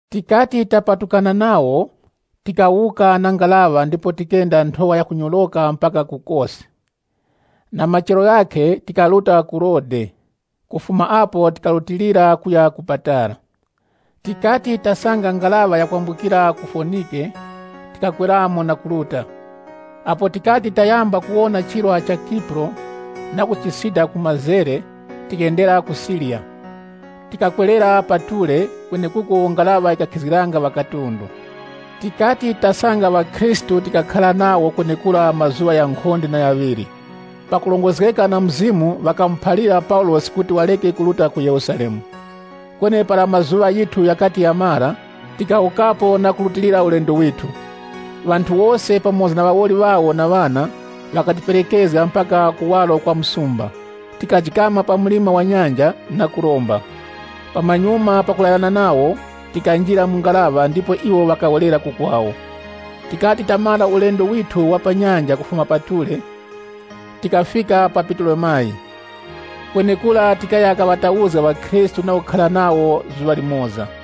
Tikati tapatukana nawo, tikawuka na ngaraŵa ndipo tikenda nthowa yakunyoroka mpaka ku Kosi. Na machero ghakhe tikaruta ku Rodesi, kufuma apo tikarutilira kuya ku Patara. Tikati tasanga ngaraŵa yakwambukira ku Fonike, tikakweramo na kuruta. Apo tikati tayamba kuwona chirwa cha Kipuro, na kuchisida ku mazere, tikendera ku Siriya. Tikakwerera pa Ture, kwenekuko ngaraŵa yikakhizgiranga ŵakatundu. Tikati tasanga ŵakhristu tikakhara nawo kwenekura mazuŵa ghankhonde na ghaŵiri. Pakurongozgeka na Mzimu ŵakamuphalira Paulosi kuti wareke kuruta ku Yerusalemu. Kweni para mazuŵa ghithu ghakati ghamara, tikawukapo na kurutilira ulendo withu. Ŵanthu wose, pamoza na ŵawoli ŵawo na ŵana, ŵakatiperekezga mpaka kuwaro kwa msumba. Tikajikama pa mlima wa nyanja, na kuromba. Pamanyuma pakulayirana nawo, tikanjira mu ngaraŵa, ndipo iwo ŵakawerera ku kwawo. Tikati tamara ulendo withu wa pa nyanja kufuma pa Ture, tikafika pa Putolemayisi. Kwenekura tikaya kaŵatauzga ŵakhristu na kukhara nawo zuŵa limoza.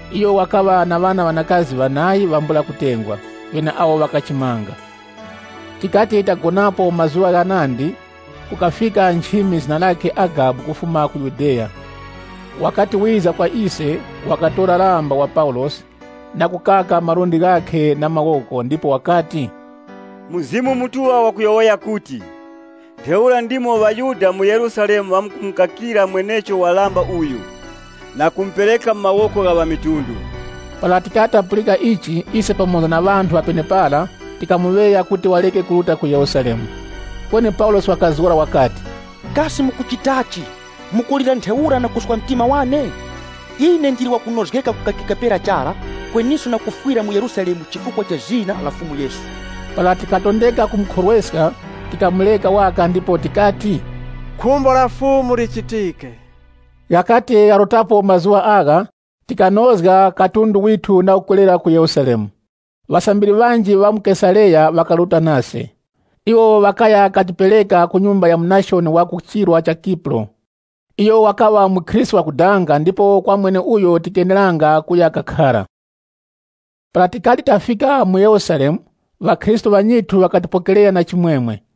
Iyo wakaŵa na ŵana ŵanakazi ŵanayi ŵambula kutengwa, ŵeneawo ŵakachimanga. Tikati tagonapo mazuŵa ghanandi, kukafika nchimi zina lakhe Agabu kufuma ku Yudeya. Wakati wiza kwa ise, wakatora lamba wa Paulosi, na kukaka malundi ghakhe na mawoko, ndipo wakati, “Mzimu Mutuŵa wakuti, ‘Ntheura ndimo ŵaYuda mu Yerusalemu ŵamkumukakira mwenecho wa lamba uyu, na kumupereka mu mawoko gha ŵamitundu.’” Para tikati tapulika ichi, ise pamoza na ŵanthu ŵa penepara, tikamuŵeya kuti wareke kuruta ku Yerusalemu. Kweni Paulosi wakazgora wakati, “Kasi mukuchitachi, mukulira ntheura na kuswa mtima wane? Ine ndili wakunozgeka kukakika pera chara, kweniso na kufwira mu Yerusalemu chifukwa cha zina la Fumu Yesu.” Para tikatondeka kumukhorweska, tikamureka waka ndipo tikati, “Khumbo la Fumu lichitike.” Ghakati gharutapo mazuŵa agha, tikanozga katundu withu na kukwerera ku Yerusalemu. Ŵasambiri ŵanji ŵa mu Kesareya ŵakaruta nase. Iwo ŵakaya katipereka ku nyumba ya Munashoni wa ku chirwa cha Kipuro. Iyo wakaŵa mukhristu wakudanga ndipo kwa mweneuyo tikeneranga kuya kakhara. Para tikati tafika mu Yerusalemu, ŵakhristu ŵanyithu ŵakatipokerera na chimwemwe.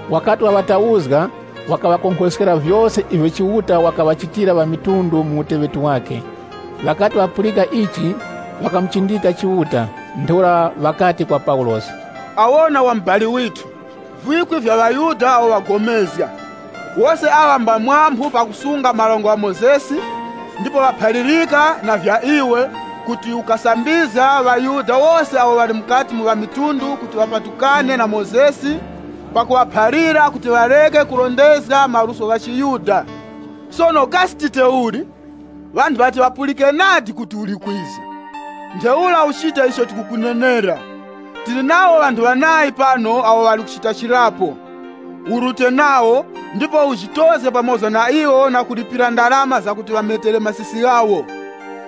Wakati waŵatauzga, wakaŵakonkhoskera vyose ivyo Chiuta wakaŵachitira ŵamitundu mu uteŵeti wakhe. Ŵakati ŵapulika ichi, ŵakamuchindika Chiuta. Ntheura ŵakati kwa Paulosi, “Awona, wa mubali withu, vikwi vya ŵaYuda awo ŵapulikana. Wose aŵa mba phamphu pakusunga Dango la Mozesi, ndipo ŵaphalirika na vya iwe, kuti ukusambizga ŵaYuda wose awo ŵali mukati mu ŵamitundu kuti ŵapatukane na Dango la Mozesi, pakuŵaphalira kuti ŵareke kurondezga maluso gha chiYuda. Sono kasi tite uli? Ŵanthu ŵati ŵapulike nadi kuti uli kwiza? Ntheura uchite icho tikukuyowoyera. Tili nawo ŵanthu ŵanayi pano awo ŵali kuchita chirapo. Urute nawo, ndipo ujitozge pamoza na iwo na kulipira ndarama zakuti ŵametere masisi ghawo.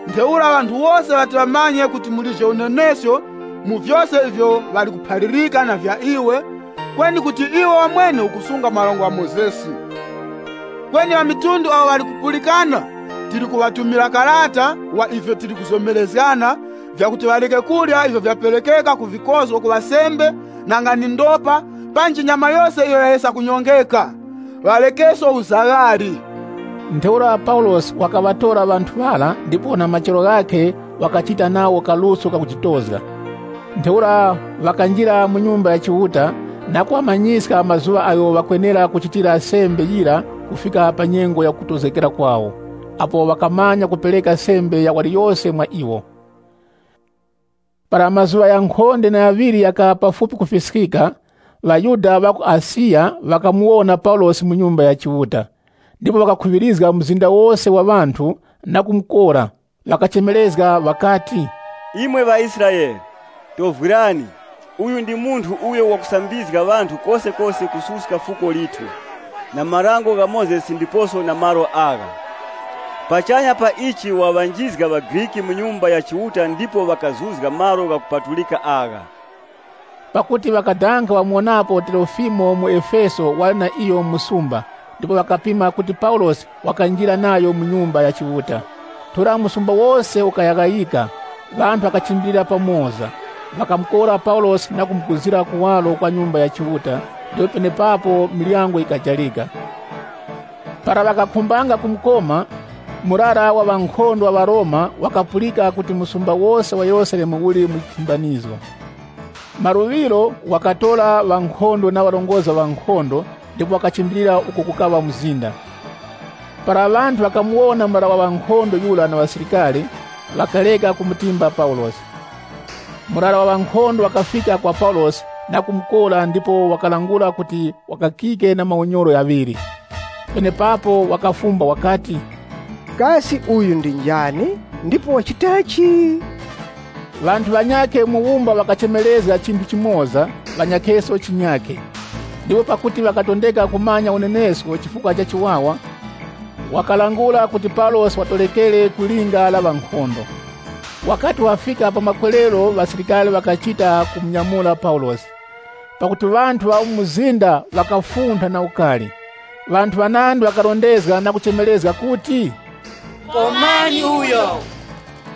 Ntheura ŵanthu wose ŵati ŵamanye kuti mulije unenesko mu vyose ivyo ŵali kuphalirika na vya iwe, kweni kuti iwe wamwene ukusunga Dango la Mozesi. Kweni ŵamitundu awo ŵali kupulikana, tili kuŵatumira karata wa ivyo tili kuzomerezgana, vyakuti ŵareke kurya ivyo vyaperekeka ku vikozgo kuŵa sembe, nanga ndi ndopa, panji nyama yose iyo yayesa kunyongeka. Ŵarekeso uzaghali.” Ntheura Paulosi wakaŵatora ŵanthu ŵara ndipo na machero ghakhe wakachita nawo kaluso kakujitozga. Ntheura ŵakanjira mu Nyumba ya Chiuta na kuŵamanyiska mazuŵa agho ŵakwenera kuchitira sembe yira kufika pa nyengo ya kutozgekera kwawo, apo ŵangamanya kupereka sembe ya waliyose mwa iwo. Para mazuŵa ghankhonde na ghaŵiri ghakaŵa pafupi kufiskika, ŵaYuda ŵa ku Asiya, ŵakamuwona Paulosi mu Nyumba ya Chiuta, ndipo ŵakakhuŵirizga mzinda wose wa ŵanthu, na kumukora. Ŵakachemerezga ŵakati, “Imwe ŵaIsraele, tovwirani! Uyu ndi munthu uyo wakusambizga ŵanthu kosekose kususka fuko lithu, na Dango la Mozesi ndiposo na malo agha. Pachanya pa ichi waŵanjizga ŵaGriki mu Nyumba ya Chiuta ndipo ŵakazuzga malo ghakupatulika agha.” Pakuti ŵakadanga ŵamuwonapo Trofimo muEfeso wali na iyo mu msumba ndipo ŵakapima kuti Paulosi wakanjira nayo mu Nyumba ya Chiuta. Ntheura msumba wose ukayaghayika, ŵanthu ŵakachimbilira pamoza. Ŵakamukora Paulosi na kumuguzira kuwaro kwa Nyumba ya Chiuta ndipo penepapo miryango yikajarika. Para ŵakakhumbanga kumukoma, murara wa ŵankhondo wa ŵaRoma wakapulika kuti msumba wose wa Yerusalemu uli mu nthimbanizgo. Maluŵiro wakatora ŵankhondo na ŵarongozgi ŵa ŵankhondo ndipo wakachimbilira uko kukaŵa mzinda. Para ŵanthu ŵakamuwona murara wa ŵankhondo yura na ŵasilikari, ŵakareka kumutimba Paulosi. Murara wa ŵankhondo wakafika kwa Paulosi na kumukora ndipo wakalangula kuti wakakike na maunyoro ghaŵiri. Penepapo wakafumba wakati, “Kasi uyu ndi njani, ndipo wachitachi?” Ŵanthu ŵanyakhe mu wumba ŵakachemerezga chinthu chimoza, ŵanyakheso chinyakhe. Ndipo pakuti wakatondeka kumanya unenesko chifukwa cha chiwawa, wakalangula kuti Paulosi watorekere ku linga la ŵankhondo. Wakati wafika pa makwerero ŵasilikari ŵakachita kumunyamura Paulosi, pakuti ŵanthu ŵa mu mzinda ŵakafuntha na ukari. Ŵanthu ŵanandi ŵakaŵarondezga na kuchemerezga kuti, “Komani uyo!”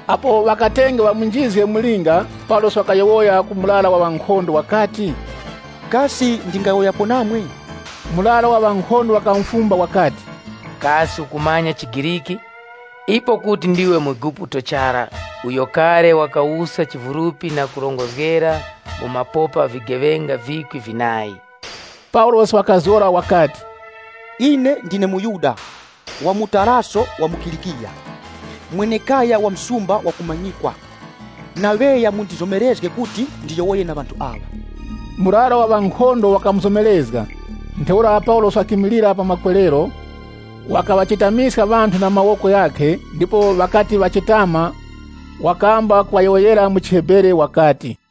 Apo ŵakatenge ŵamunjizge mu linga, Paulosi wakayowoya ku murara wa ŵankhondo wakati, “Kasi ndingayowoyapo namwe?” Murara wa ŵankhondo wakamufumba wakati, “Kasi ukumanya chiGriki? Ipo kuti ndiwe muEguputo chara uyo kale wakawuska chivulupi na kurongozgera mu mapopa vigeŵenga vikwi vinayi?” Paulosi wakazgora wakati, “Ine ndine muYuda, wa mu Taraso wa mu Kilikiya, mwenekaya wa msumba wakumanyikwa, ndaŵeya mundizomerezge kuti ndiyowoye na ŵanthu aŵa.” Murara wa ŵankhondo wakamuzomerezga. Ntheura Paulosi wakimilira pa makwerero, wakaŵachetamiska ŵanthu na mawoko ghakhe ndipo ŵakati ŵachetama wakamba kuŵayowoyera mu chiHebere wakati,